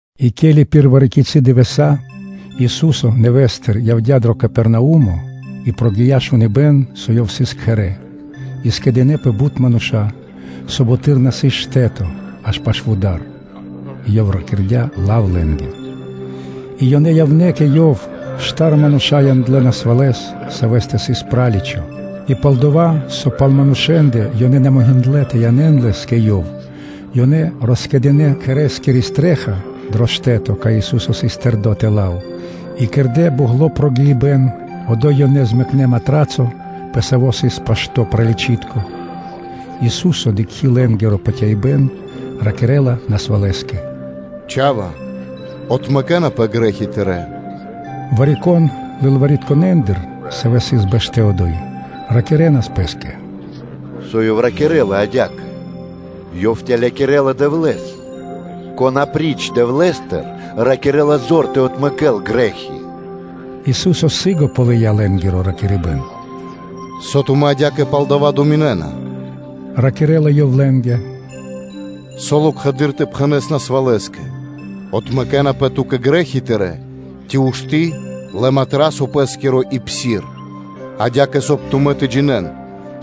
И пир вари-кицы́ дывэса́ Ису́со нэвэ́стыр явдя́ дро Капернаумо, и прогия́ шуныбэ́н, со Ёв сыс кхэрэ́. И скэдынэ́пэ бут мануша́, со буты́р на сыс штэ́то, аж пашы́л вуда́р и Ёв ракирдя́ лав лэ́нгэ. И ёнэ явнэ́ кэ Ёв; штар мануша́ яндлэ́ насвалэс, савэ́стэ сыс праличо. И пал-дова́, со пал манушэ́ндэ ёнэ на могиндлэ́ тэ янэ́н лэс кэ Ёв, ёнэ роскэдынэ кхэрэ́скири стрэ́ха (чхаки́н) дро штэ́то, кай Ису́со сыс тэрдо́ тэла́л, и кэрдэ́ бу΄гло прогиибэн, и одо́й ёнэ змэкнэ матрацо, пэ саво́ сыс пашто́ праличытко. Ису́со, дыкхи́ лэ́нгиро патяибэ́н, ракирэ́ла насвалэскэ: “Чха́ва, отмэкэнапэ грэ́хи тырэ́.” Вари-кон лылваритконэндыр, савэ́ сыс бэштэ́ одо́й, ракирэ́нас дрэ пэ́стэ: “Со Ёв ракирэ́ла адя́кэ? Ёв тэлякирэла Дэвлэ́с. Кон апри́ч Дэвлэ́стэ рикирэ́ла зор тэ отмэкэ́л грэ́хи?” Ису́со сы́гэс ґалыя́ лэ́нгиро ракирибэ́н. “Со тумэ́ адя́кэ пал дава́ думинэ́на дрэ тумарэ́ илэ?” – ракирэ́ла Ёв лэ́нгэ. Со локхэды́р тэ пхэнэ́с насвалэскэ: “Отмэкэнапэ ту́кэ грэ́хи тырэ́”, ци “Ушты́, лэ матрацо пэ́скиро и псир?” Адя́кэ, соб (кай) тумэ́ тэ джинэ́н,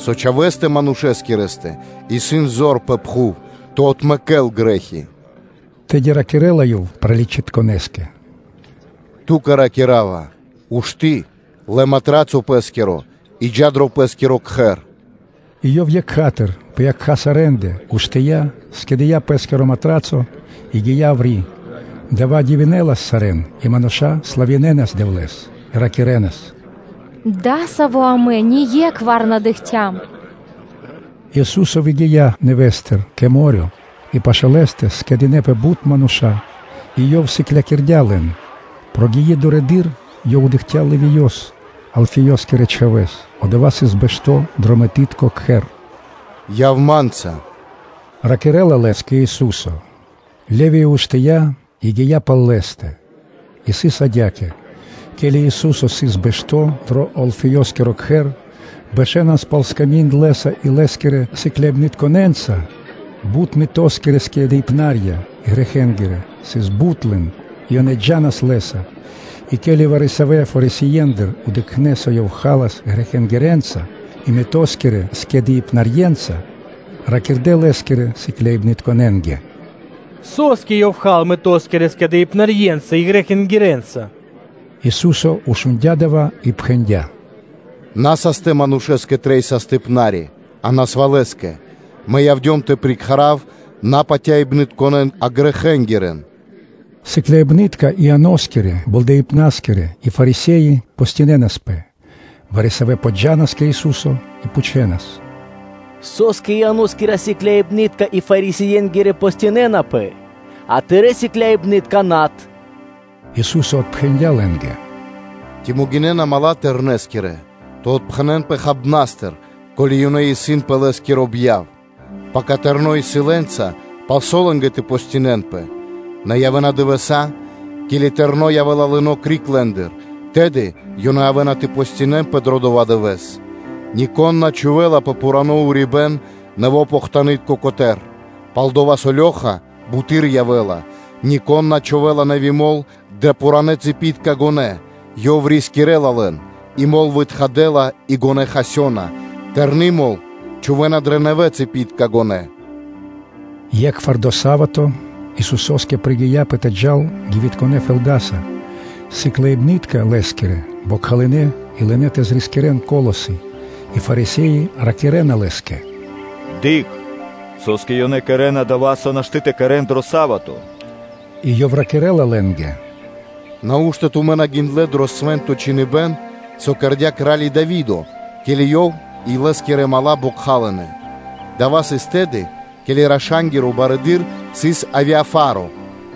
со Чхавэ́стэ Манушэскирэстэ исын зор пэ пхув тэ отмэкэ́л грэ́хи.” Тэды ракирэ́ла Ёв праличытконэскэ: “Ту́кэ ракира́ва: “Ушты́, лэ матрацо пэ́скиро и джа́ дро пэ́скиро кхэр.” И ёв екха́тыр (сра́зу), пэ якха́ сарэ́ндэ, уштыя́, скэдыя́ пэ́скиро матрацо и гия́ яври́. Дава́ дивинэлас сарэ́н, и мануша́ славинэнас Дэвлэ́с и ракирэ́нас: “Дасаво амэ ние́кхвар на дыкхцям!” И Ису́со гия́ нэвэ́стыр кэ мо́рё (дэрья́в), и пашы́л Лэ́стэ скэдынэ́пэ бут мануша́ и Ёв сыклякирдя́ лэн. Прогии дурэды́р, Ёв дыкхця́ Левиёс, Алфеёскирэ чхавэ́с. Одова́ сыс бэшто́ дро мытытко кхэр. “Яв Ма́нца”, – ракирэ́ла Лэ́скэ Ису́со. Левиё уштыя́ и гия́ пал Лэ́стэ. И сыс адя́кэ: ке́ли Ису́со сыс бэшто́ дро Алфеёскиро кхэр, бэшэнас пал сками́нд Лэ́са и Лэ́скирэ сыкляибнытконэ́нца бут мытоскирэ скэдыибнарья и грэхэнгирэ; сыс бут лэн, и ёнэ джа́нас Лэ́са. И ке́ли вари-савэ́ Фарисиендыр дыкхнэ́, со Ёв халас грэхэнгирэнца и мытоскирэ скэдыибнарьенца, ёнэ ракирдэ́ Лэ́скирэ сыкляибнытконэ́нгэ: “Со́скэ Ёв ха́ла мытоскирэ скэдыибнарьенца и грэхэнгирэнца?” Ису́со шундя́ дава́ и пхэндя́: “На састэ манушэ́нгэ трэй састыпнари (докторо), а насвалэнгэ. Мэ явдём тэ прикхарав на патяибнытконэн, а грэхэнгирэн.” Сыкляибны́тка Ианоскирэ Болдэипнарискирэ и Фарисе́и постинэнаспэ. Вари-савэ́ подджанас кэ Ису́со и пхучэнас: “Со́скэ Ианоскирэ сыкляибны́тка и Фарисиенгирэ постинэнапэ, а Тырэ́ сыкляибны́тка-над?” Ису́со отпхэндя́ лэ́нгэ: “Ци могинэ́на дру́ги (мала́) Тэрнэскирэ тэ отпхэнэнпэ хабнастыр, ко́ли ёнэ исын пэ Лэ́скиро бьяв? Пака Тэрно́ исын лэ́нца, палсо́ лэ́нгэ тэ постинэнпэ? Нэ явэ́на дывэса́, ке́ли Тэрно́ явэ́ла лыно́ криг лэ́ндыр, тэды ёнэ явэ́на тэ постинэнпэ дро дова́ дывэ́с. Нико́н на чхувэ́ла пэ пхурано́ урибэ́н нэво́ похтанытко котэ́р. Пал-дова́ со лёха (дирка) буты́р явэ́ла. Нико́н на чхувэ́ла нэви́ мол (вино) дро пхуранэ́ цыпитка гонэ́, ёй рискирэ́ла лэн и мол вытхадэла и гонэ́ хасёна. Тэрны́ мол чхувэ́на дрэ нэвэ цыпитка гонэ́.” Екхвар дро са́вато (субо́та) Исусо́скэ пригияпэ тэ джал гивитконэ фэлдаса. Сыкляибны́тка Лэ́скирэ бокхалынэ и лынэ́ тэ зрискирэн колосы. И Фарисе́и ракирэ́на Лэ́скэ: “Дыкх, со́скэ ёнэ кэрэ́на дова́, со нашты́ тэ кэрэ́н дро са́вато? И ёв ракирэ́ла лэ́нгэ: “Нау́што тумэ́ на гиндлэ́ дро Свэ́нто Чхиныбэ́н, со кэрдя́ кра́ли Дави́до, ке́ли ёв и лэ́скирэ мала́ бокхалынэ: дава́ сыс тэды, ке́ли раша́нгиро барыдыро́ сыс Авиафаро;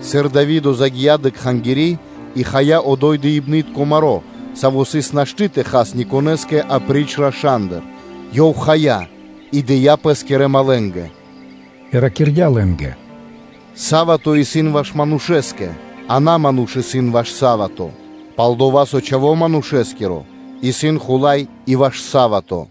сыр Дави́до загия́ дрэ Кхангири́ и хая одо́й дыибнытко маро́, саво́ сыс нашты́ тэ хал никонэ́скэ апри́ч рашандэ! Ёв хая, и дыя́ пэ́скирэ малэнгэ.” И ракирдя́ лэ́нгэ: “Са́вато (субо́та) исын ваш манушэ́скэ, а на ману́ш исын ваш са́вато; пал-дова́ со Чхаво́ Манушэ́скиро исын Хула́й и пэ са́вато.”